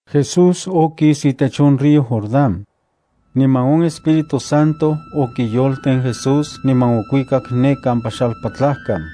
Jesús okis itech on río Jordán. Niman on Espíritu Santo okiyolten Jesús niman okuikak ne kampa xalpatlajkan.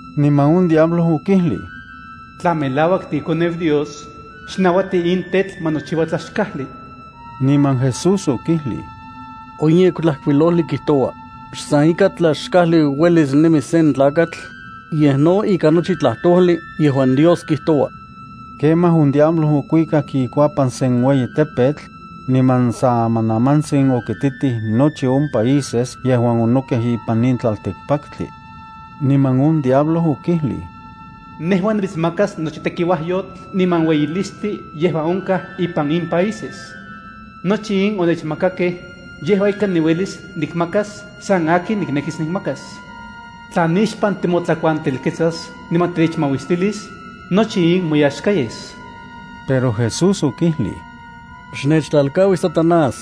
Niman on diablo okijlij: —Tla melauak tiiKoneu Dios, xnauati in tetl ma nochiua tlaxkajli. Niman Jesús okijlij: —On Yektlajkuilojli kijtoua: “Xsan ikan tlaxkajli uelis nemis sen tlakatl, yej no ikan nochi tlajtojli yejuan Dios kijtoua.” Kemaj on diablo okuikak ikuapan sen ueyi tepetl, niman san amanamantsin okititij nochi on países yejuan onokej ipan in tlaltikpaktli. Niman on diablo okijlij: —Nejua nimitsmakas nochi tekiuajyotl niman ueyilistli yejuan onkaj ipan in países. Nochi in onechmakakej, yejua ika niuelis nikmakas san akin niknekis nikmakas. Tla nixpan timotlakuantelketsas niman tinechmauistilis, nochi in moyaxka yes. Pero Jesús okijlij: —Xnechtlalkaui, Satanás,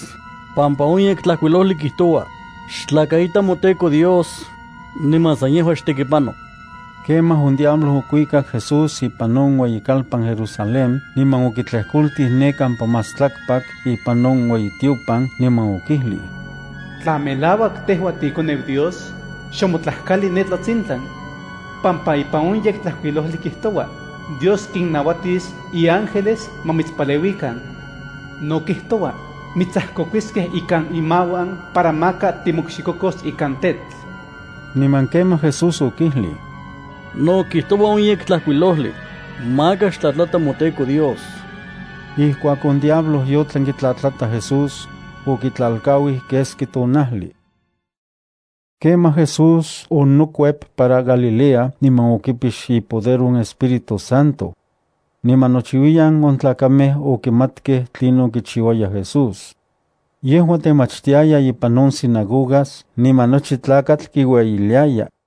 pampa on Yektlajkuilojli kijtoua: “Xtlakaita moTEKO Dios, niman san yejua xtekipano.” Kemaj on diablo okuikak Jesús ipan on ueyikalpan Jerusalén niman okitlejkoltij ne kampa más tlakpak ipan on ueyitiopan, niman okijlij: —Tla melauak tejua tiiKoneu Dios, xonmotlajkali ne tlatsintlan, pampa ipan on Yektlajkuilojli kijtoua: Dios kinnauatis iángeles ma mitspaleuikan. No kijtoua: Mitsajkokuiskej ikan inmauan para maka timokxikokos ikan tetl. Niman kemaj Jesús okijlij: —No kijtoua on Yektlajkuilojli: “Maka xtlatlata moTEKO Dios.” Ijkuak on diablo yotlan kitlatlata Jesús, okitlalkauij keski tonajli. Kemaj Jesús onokuep para Galilea niman okipix ipoder on Espíritu Santo. Niman nochiuiyan on tlakamej okimatkej tlinon kichiuaya Jesús. Yejua temachtiaya ipan on sinagogas niman nochi tlakatl kiueyiliaya.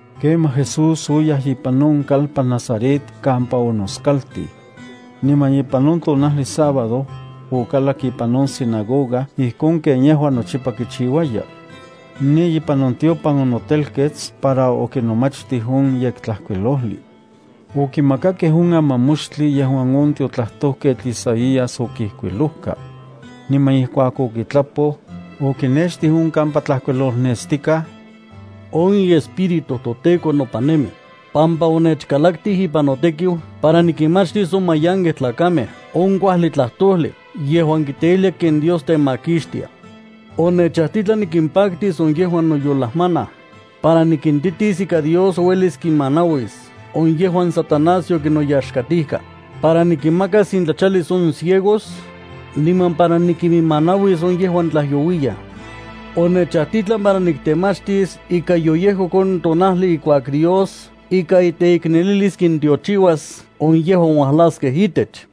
Kemaj Jesús oyaj ipan on kalpan Nazaret kampa onoskaltij. Niman ipan on tonajli sábado, okalak ipan on sinagoga ijkon ken yejua nochipa kichiuaya. Ne ipan on tiopan onotelkets para okinomachtij on Yektlajkuilojli. Okimakakej on amamoxtli yejuan on tiotlajtojketl Isaías okijkuilojka. Niman ijkuak okitlapoj, okinextij on kampa tlajkuilolnestikaj: On iEspíritu toTEKO nopan nemi, pampa onechkalaktij ipan notekiu para nikinmachistis on mayankej tlakamej on kuajli tlajtojli yejuan kiteijlia ken Dios temakixtia. Onechajtitlan nikimpaktis on yejuan noyolajmanaj, para nikintitis ika Dios uelis kinmanauis on yejuan Satanás yokinnoyaxkatijka, para nikiminmakas intlachalis on ciegos, niman para nikiminmanauis on yejuan tlajyouiyaj. Onechajtitlan para niktemachistis ika yoyejkok on tonaltin ijkuak Dios ikan iteiknelilis kintiochiuas on yejuan ualaskej itech.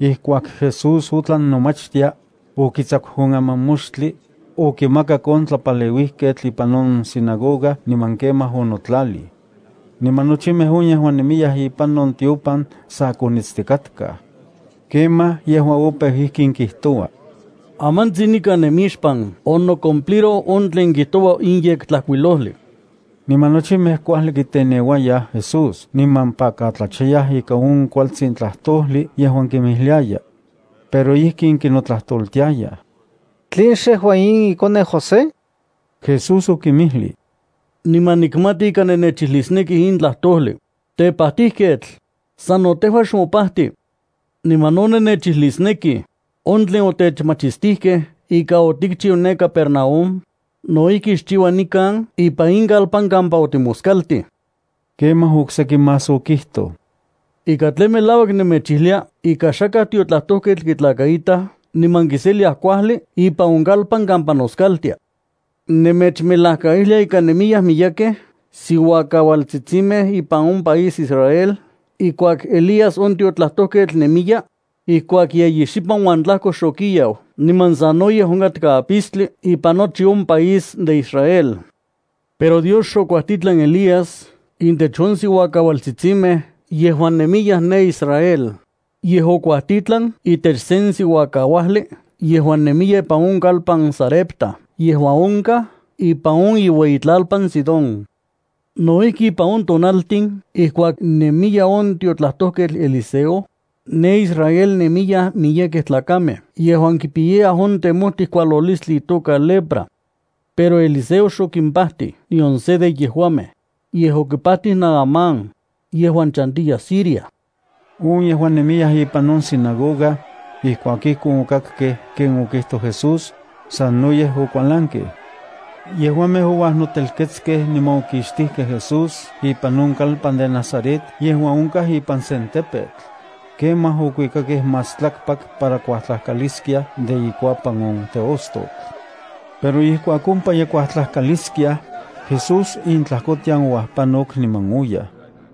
Ijkuak Jesús otlan nomachtia, okitsaku on amamoxtli, okimakak on tlapaleuijketl ipan on sinagoga niman kemaj onotlalij. Niman nochimej on yejuan nemiyaj ipan on tiopan sa konitstikatkaj. Kemaj yejua opeu ijkin kijtoua: —Amantsin nikan nemixpan onocumpliroj on tlen kijtoua in Yektlajkuilojli. Niman nochimej kuajli kiteneuayaj Jesús niman pakatlachayaj ika on kualtsin tlajtojli yejuan kinmijliayaj. Pero ijkin kinotlajtoltiayaj: —¿Tlen xejua in ikoneu José? Jesús okinmijlij: —Niman nikmati ika nennechijlisnekij in tlajtojli: “Tepajtijketl, sano tejua xmopajti.” Niman no nennechijlisnekij: “On tlen otechmachistijkej ika otikchiu ne Capernaúm, no ijki xchiua nikan ipan in kalpan kampa otimoskaltij.” Kemaj oksejki más okijtoj: —Ika tlen melauak nemechijlia ika xakaj tiotlajtojketl kitlakaitaj niman kiseliaj kuajli ipan on kalpan kampa noskaltia. Nemechmelajkaijlia ika nemiyaj miyekej siuakaualtsitsimej ipan on país Israel ijkuak Elías on tiotlajtojketl nemiya, ijkuak yeyi xipan uan tlajko xokiau niman sanoyej onkatka apistli ipan nochi on país de Israel. Pero Dios xokuajtitlan Elías intech on siuakaualtsitsimej yejuan nemiyaj ne Israel, yej okuajtitlan itech sen siuakauajli yejuan nemiya ipan on kalpan Sarepta yejuan onkaj ipan on iueyitlalpan Sidón. No ijki ipan on tonaltin ijkuak nemiya on tiotlajtojketl Eliseo, ne Israel nemiyaj miyekej tlakamej yejuan kipiyayaj on temojtij kualolistli itoka lepra. Pero Eliseo xokimpajtij nion se de yejuamej, yej okipajtij Naamán, yejuan chantiya Siria. On yejuan nemiyaj ipan on sinagoga, ijkuak ijkon okakkej ken okijtoj Jesús, sanoyej okualankej. Yejuamej ouajnotelketskej niman okixtijkej Jesús ipan on kalpan de Nazaret yejuan onkaj ipan sen tepetl. Kemaj okuikakej más tlakpak para kuajtlajkaliskiaj de ikuapan on teostotl. Pero ijkuak ompa ye kuajtlajkaliskiaj, Jesús intlajkotian ouajpanok niman oyaj.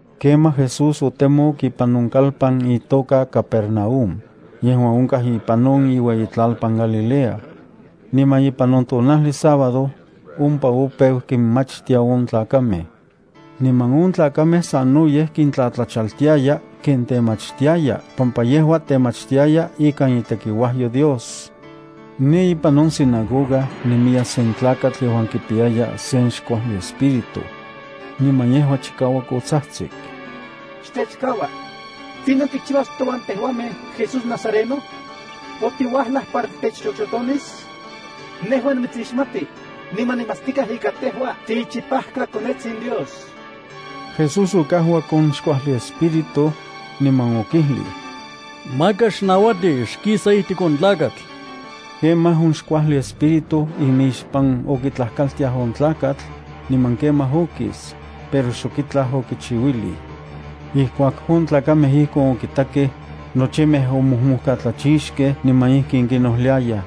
Kemaj Jesús otemok ipan on kalpan itoka Capernaúm, yejuan onkaj ipan on iueyitlalpan Galilea. Niman ipan on tonajli sábado, ompa opeu kinmachtia on tlakamej. Niman on tlakamej sanoyej kintlatlachaltiaya ken temachtiaya pampa yejua temachtiaya ikan itekiuajyo Dios. Ne ipan on sinagoga nemiya sen tlakatl yejuan kipiyaya sen xkuajli espíritu. Niman yejua chikauak otsajtsik: —¡Xtechkaua! ¿Tlinon tikchiuas touan tejuamej, Jesús nazareno? ¿Otiuajlaj para titechxoxotonis? Nejua nimitsixmati, niman nikmatstikaj ika tejua tiichipajkaKonetsin Dios. Jesús okajuak on xkuajli espíritu, niman okijlij: —¡Maka xnauati! ¡Xkisa ijtik on tlakatl! Kemaj on xkuajli espíritu imixpan okitlajkaltiaj on tlakatl, niman kemaj okis, pero xok itlaj okichiuilij. Ijkuak on tlakamej ijkon okitakej, nochimej omojmojkatlachixkej niman ijkin kinojliayaj: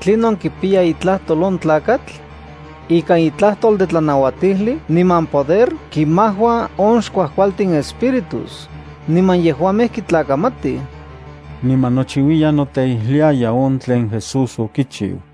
—¿Tlinon kipiya itlajtol on tlakatl? ¡Ikan itlajtol de tlanauatijli niman poder kinmajua on xkuajkualtin espíritus, niman yejuamej kitlakamatij! Niman nochiuiyan noteijliaya on tlen Jesús okichiu.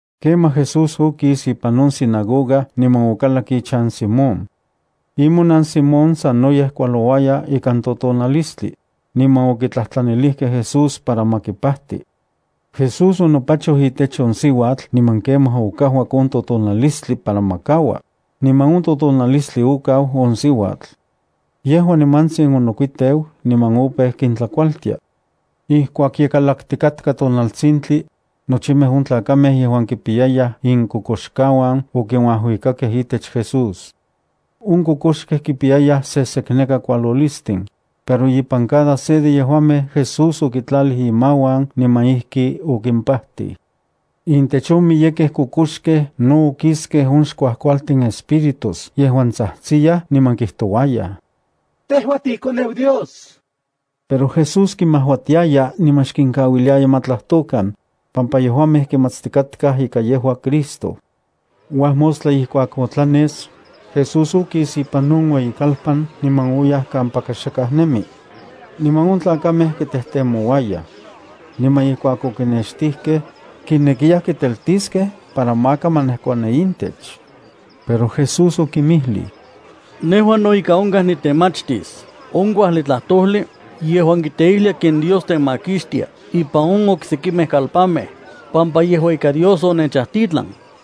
Kemaj Jesús okis ipan on sinagoga niman okalak ichan Simón. Imonan Simón sanoyej kualouaya ikan totonalistli, niman okitlajtlanilijkej Jesús para ma kipajti. Jesús onopachoj itech on siuatl niman kemaj okajuak on totonalistli para ma kaua, niman on totonalistli okau on siuatl. Yejua nimantsin onokuiteu niman opeu kintlakualtia. Ijkuak ye kalaktikatka tonaltsintli, nochimej on tlakamej yejuan kipiyayaj inkokoxkauan okinuajuikakej itech Jesús. On kokoxkej kipiyayaj sesekneka kualolistin, pero ipan cada se de yejuamej Jesús okitlalij imauan niman ijki okimpajtij. Intech on miyekej kokoxkej no okiskej on xkuajkualtin espíritus yejuan tsajtsiyaj niman kijtouayaj: —¡Tejua tiiKoneu Dios! Pero Jesús kimajuatiaya niman xkinkauiliaya ma tlajtokan, pampa yejuamej kimatstikatkaj ika yejua Cristo. Uajmostla ijkuak otlanes, Jesús okis ipan on ueyikalpan niman oyaj kampaka xakaj nemi. Niman on tlakamej kitejtemouayaj. Niman ijkuak okinextijkej, kinekiyaj kiteltiskej para maka ma nejkuani intech. Pero Jesús okinmijlij: —Nejua no ika onkaj nitemachtis on kuajli tlajtojli yejuan kiteijlia ken Dios temakixtia ipan on oksekimej kalpanmej, pampa yejua ika Dios onechajtitlan.